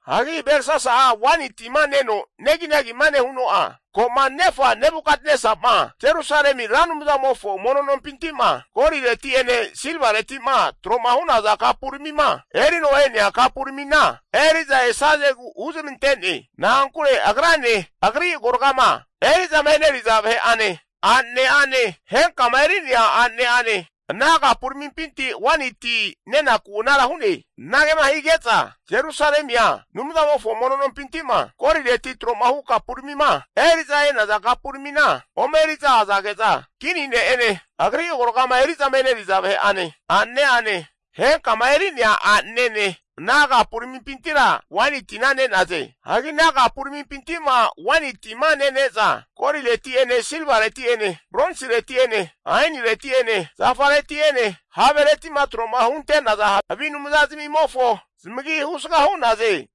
Hagi Belsasa'a waini tima neno neginagima nehuno'a, ko'ma nefa Nebukatnesa'ma Jerusalemi Ra Anumzamofo mono nompinti'ma golireti'ene silvareti'ma tro'ma hu'naza kapuramima erino e'nea kapuramina eri'za esazegu huzmante'ne. Na'ankure agrane, agri agoragama eri'zama eneriza vahe'ane, a'nane'ane henkama eri'nea a'nane'ane ana kapuramimpi waini ti nenaku anara hu'ne. Anagema hige'za Jerusalemia Anumzamofo mono nompinti'ma golireti tro'ma hu kapuramima eri'za e'naza kapuramina ome eri'za azage'za, kini ne'ene, agri agoragama eri'zama eneriza vahe'ane, a'nane'ane, henkama eri'nea a'nanene ana kapuramimpintira waini tina ne'naze. Hagi ana kapuramimpinti'ma waini tima nene'za, golireti'ene, silvareti'ene, bronsireti'ene, ainireti'ene, zafareti'ene, havereti'ma tro'ma hunte'naza havi anumzazamimofo zamagi husga hu'naze.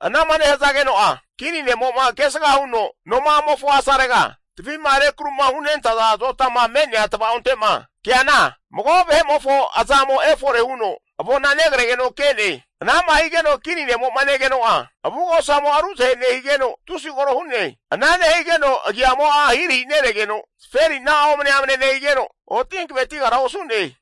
Anama nehazageno'a, kini ne'mo'ma kesga huno noma'amofo asarega, tavi'ma rekru'ma hunentaza azotama me'nea tvaonte'ma keana, mago vahe'mofo azamo efore huno avona negregeno ke'ne. Anama higeno kini nemo'ma negegeno'a, avugosamo'a ruzahe nehigeno, tusi koro hu'ne. Ana nehigeno agiamo'a ahirahi neregeno, zaferina'a omne'amne nehigeno, oti hankavetigara osu'ne.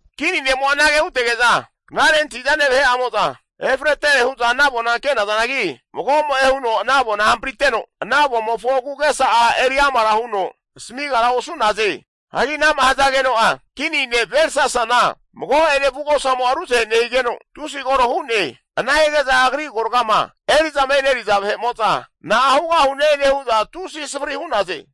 Kini ne'mo'a anage hutege'za knare antahi'zane vahe'amo'za efretere hu'za ana avona ke'nazanagi, magomo'e huno ana avona hampriteno, ana avomofo agu'agesa'a eri amara huno asamigara osu'naze. Hagi ana'ma hazageno'a kini ne' Belsasana mago'ene avugosamo'a ruzahe nehigeno, tusi koro hu'ne. Ana hige'za agri agoragama eri'zama eneriza vahe'mo'za na'a hugahune nehu'za tusi savri hu'naze.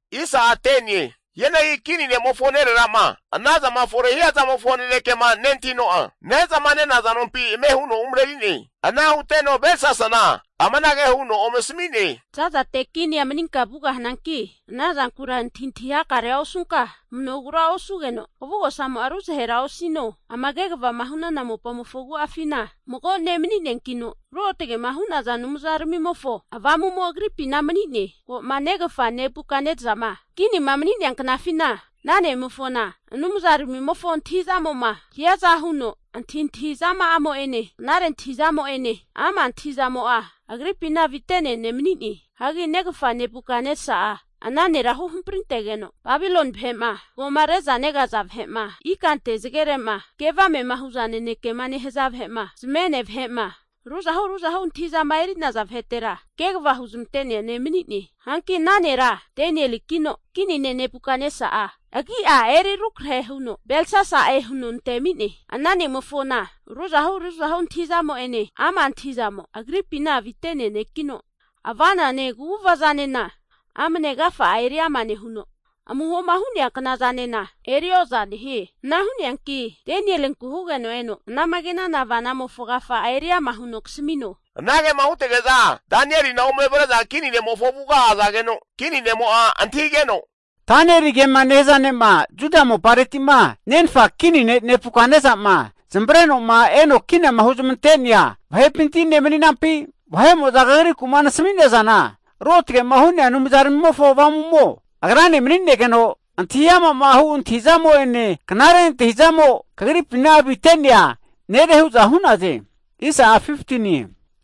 Hianagi kini ne'mofo nerera'ma anazama fore hia zamofo nanekema nentahino'a, ne'zama nenaza nompi ame huno umareri'ne. Ana huteno Belsasana amanage huno ome asami'ne. Za'zate kinia maninka vugahananki, ana zankura antahintahi hakarea nehunka kamanogura osugeno, kavugosamo'a ruzahera osino. Ama kegavama hu'nana mopamofo agu'afina mago ne' mani'neankino, ruotage'ma hu'naza anumzaramimofo avamu'mo agripina mani'ne. Ko'ma negafa Nebukatnesa'ma kinima mani'nea knafina, ana ne'mofona anumzaramimofo antahi'zamo'ma hiaza huno, antahintahi zama'amo'ene, knare antahi'zamo'ene ama' antahi'zamo'a agripina avite'nea ne' mani'ne. Hagi negafa Nebukatnesa'a ana nera huhamprintegeno, Babiloni vahe'ma zagoma re'za negaza vahe'ma, ikante zagere'ma ke avame'ma huza nanekema nehaza vahe'ma, zamene vahe'ma, ruzahu ruzahu antahi'zama eri'naza vahetera kegava huzmante'nea ne' mani'ne. Hanki ana nera Danielikino, kini ne' Nebukatnesa'a agi'a eri rukrahe huno Belsasa'e huno antemi'ne. Ana ne'mofona ruzahu antahi'zamo'ene ama' antahi'zamo agripina avite'nea nekino, ava'nane kaguvazanena amne agafa'a eriama nehuno, amuhoma hu'nea knazanena erioza nehie. Ana hu'neanki Danielinku hugeno eno anama ke'nana avomofo agafa'a eriama huno kasamino. Anagema hutege'za Danielina ome avre'za kini ne'mofo avuga azageno, kini ne'mo'a antahigeno, kagra Danieligema nehaza ne'ma Juda mopareti'ma nenfa kini ne' Nebukatnesa'ma zamavareno eno kinama huzmantenea vahepinti ne' mani'nampi? Vahe'moza kagriku'ma nasamina zana, ruotage'ma hu'nea anumzaramimofo avamu'mo agrane mani'negeno, antahi ama'ma hu' antahizamo'ene knare antahi'zamo kagripina avite'nea nere hu'za hu'naze.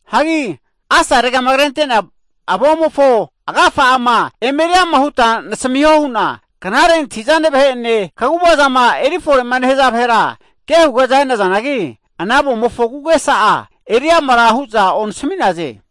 Hagi asaregama krente'nea avomofo agafa'ama eme eri ama huta nasamiho hu'na knare antahi'zane vahe'ene kaguvazama eri fore'ma nehaza vahera kehuge'za e'nazanagi, ana avomofo agu'agesa'a eri amara hu'za onasami'naze.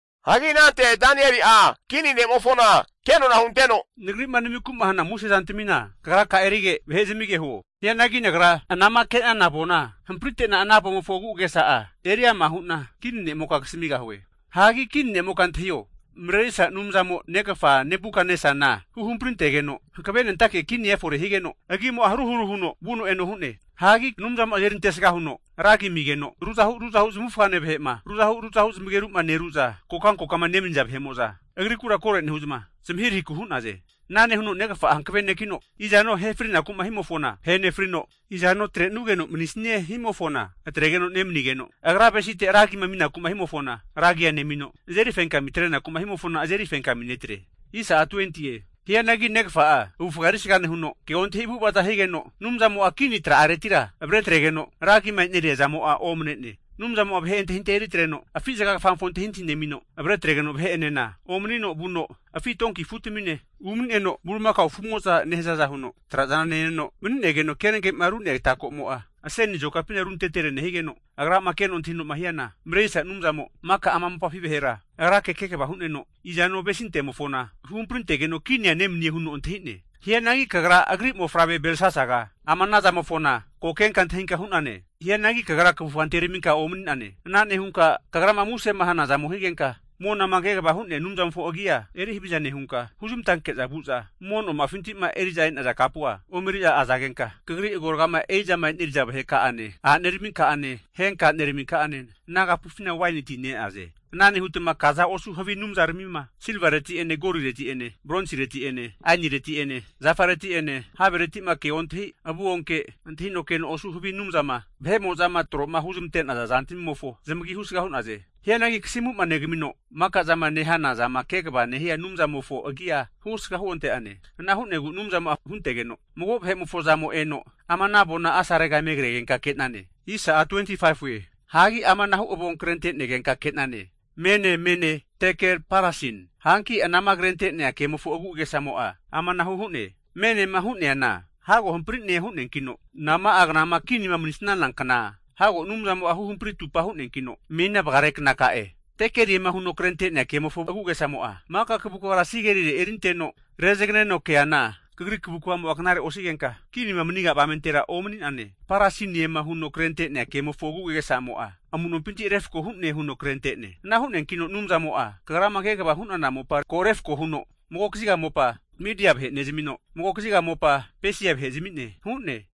Hagi anante Danieli'a kini ne'mofona kenona hunteno, nagri'ma namiku'ma hana muse zantamina kagraka'a erige, vahe zamige huo. Hianagi nagra anama ke'nana avona hamprite'na ana avomofo agu'agesa'a eri ama hu'na kini ne'moka kasamigahue. Hagi kini ne'moka antahio, Marerisa Anumzamo negafa Nebukatnesana huhampri antegeno, hankavenentake kinia efore higeno, agimo'a haru haru huno vuno eno hu'ne. Hagi Anumzamo'a azerintesga huno ra agi amigeno, ruzahu ruzahu zamavufagane vahe'ma, ru zamageru ru zamageru'ma neru'za kokankokama nemaniza vahe'mo'za, agrikura koro nehu'zma zamahirahiku hu'naze. Ana nehuno negafa'a hankave nekino, izano ahe frinaku'ma himofona ahe nefrino, izano atre'nugeno manisanie himofona atregeno nemanigeno, agra avesite ragima aminaku'ma himofona ra agia nemino, azeri fenkami atrenaku'ma himofona azeri fenkami netre. Hianagi negafa'a avufga erisga nehuno, keontahi avu'ava'za higeno, Anumzamo'a kini tra'aretira avre atregeno, ragima e'neria zamo'a omanene. Anumzamo'a vahe antahintahia eritreno afi zaga kfamofo antahintahi nemino, avre atregeno vahe'enena omanino vuno afi donki afutamine umani'neno, bulimakao afu'mozama nehazaza huno trazana neneno mani'negeno kenage'ma ru'nea ata ko'mo'a aseni azokapina runtetere nehigeno, agrama keno antahino'ma hiana Marerisa Anumzamo maka ama mopafi vahera agrake kegava hu'neno, izano avesinte'mofo huhamparintegeno kinia nemanie huno antahi'ne. Hianagi kagra agri mofavre Belsasaga ama ana zamofona ko kenka antahinka hu'nane. Hianagi kagra kavufga anteraminka omani'nane. Ana nehunka kagrama musema hanazamo higenka, monama kegavama hu'nea Anumzamofo agi'a eri haviza nehunka, huzmantanke'za vu'za mono noma'afinti'ma eri'za e'naza kapua ome eri'za azagenka, kagri agoragama eri'zama eneri'za vaheka'ane a'naneraminka'ane, henka a'neraminka'ane ana kapufina waini tina ne'naze. Ana nehutma kaza osu havi anumzaramima silvareti'ene golireti'ene bronsireti'ene ainireti'ene zafareti'ene havereti'ma keaga ontahi, avu onke, antahino keno osu havi anumzama vahe'mo'zama tro'ma huzmante'naza zantamimofo zamagi husga hu'naze. Hianagi kasimu'ma negamino, maka zama nehana zama kegava nehia Anumzamofo agia husga huonte'nane. Ana hu'negu Anumzamo'a huntegeno mago vahe'mofo azamo eno ama ana avona asarega eme kregenka ke'nane. Hagi amanahu avonkrente'negenka ke'nane, MENE, MENE, TEKEL, PARSIN. Hanki anama krente'nea kemofo agu'agesamo'a amanahu hu'ne. MENEMA hu'neana, hago hampari'ne hu'neankino, nama'a knama kinima manisnana kna hago Anumzamo'a hampri atupa hu'neankino menina vagare knaka'e. TEKELIEMA huno krente'nea kemofo agu'agesamo'a, Maka kavukvara sigerire erinteno rezaganeno keana, kagri kavukvamo'a knare osigenka kinima maniga avamentera omani'nane. PARSINIEMA huno krente'nea kemofo agu'agesa'amo'a, Amu'nompinti refko hu'ne huno krente'ne. Ana hu'neankino Anumzamo'a kagrama kegava hu'nana mopa ko refko huno, mago kaziga mopa Midia vahe nezamino, mago kaziga mopa Pesia vahe zami'ne hu'ne.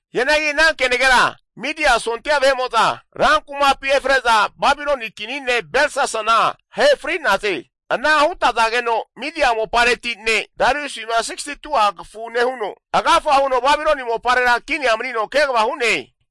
Hianagi ana kenagera Midia sondia vahe'mo'za ran kumapi efre'za Babiloni kini ne' Belsasana ahe fri'naze. Ana hutazageno Midia mopareti ne' Dariusi'ma 62'a kafu nehuno, agafa huno Babiloni moparera kinia manino kegava hu'ne.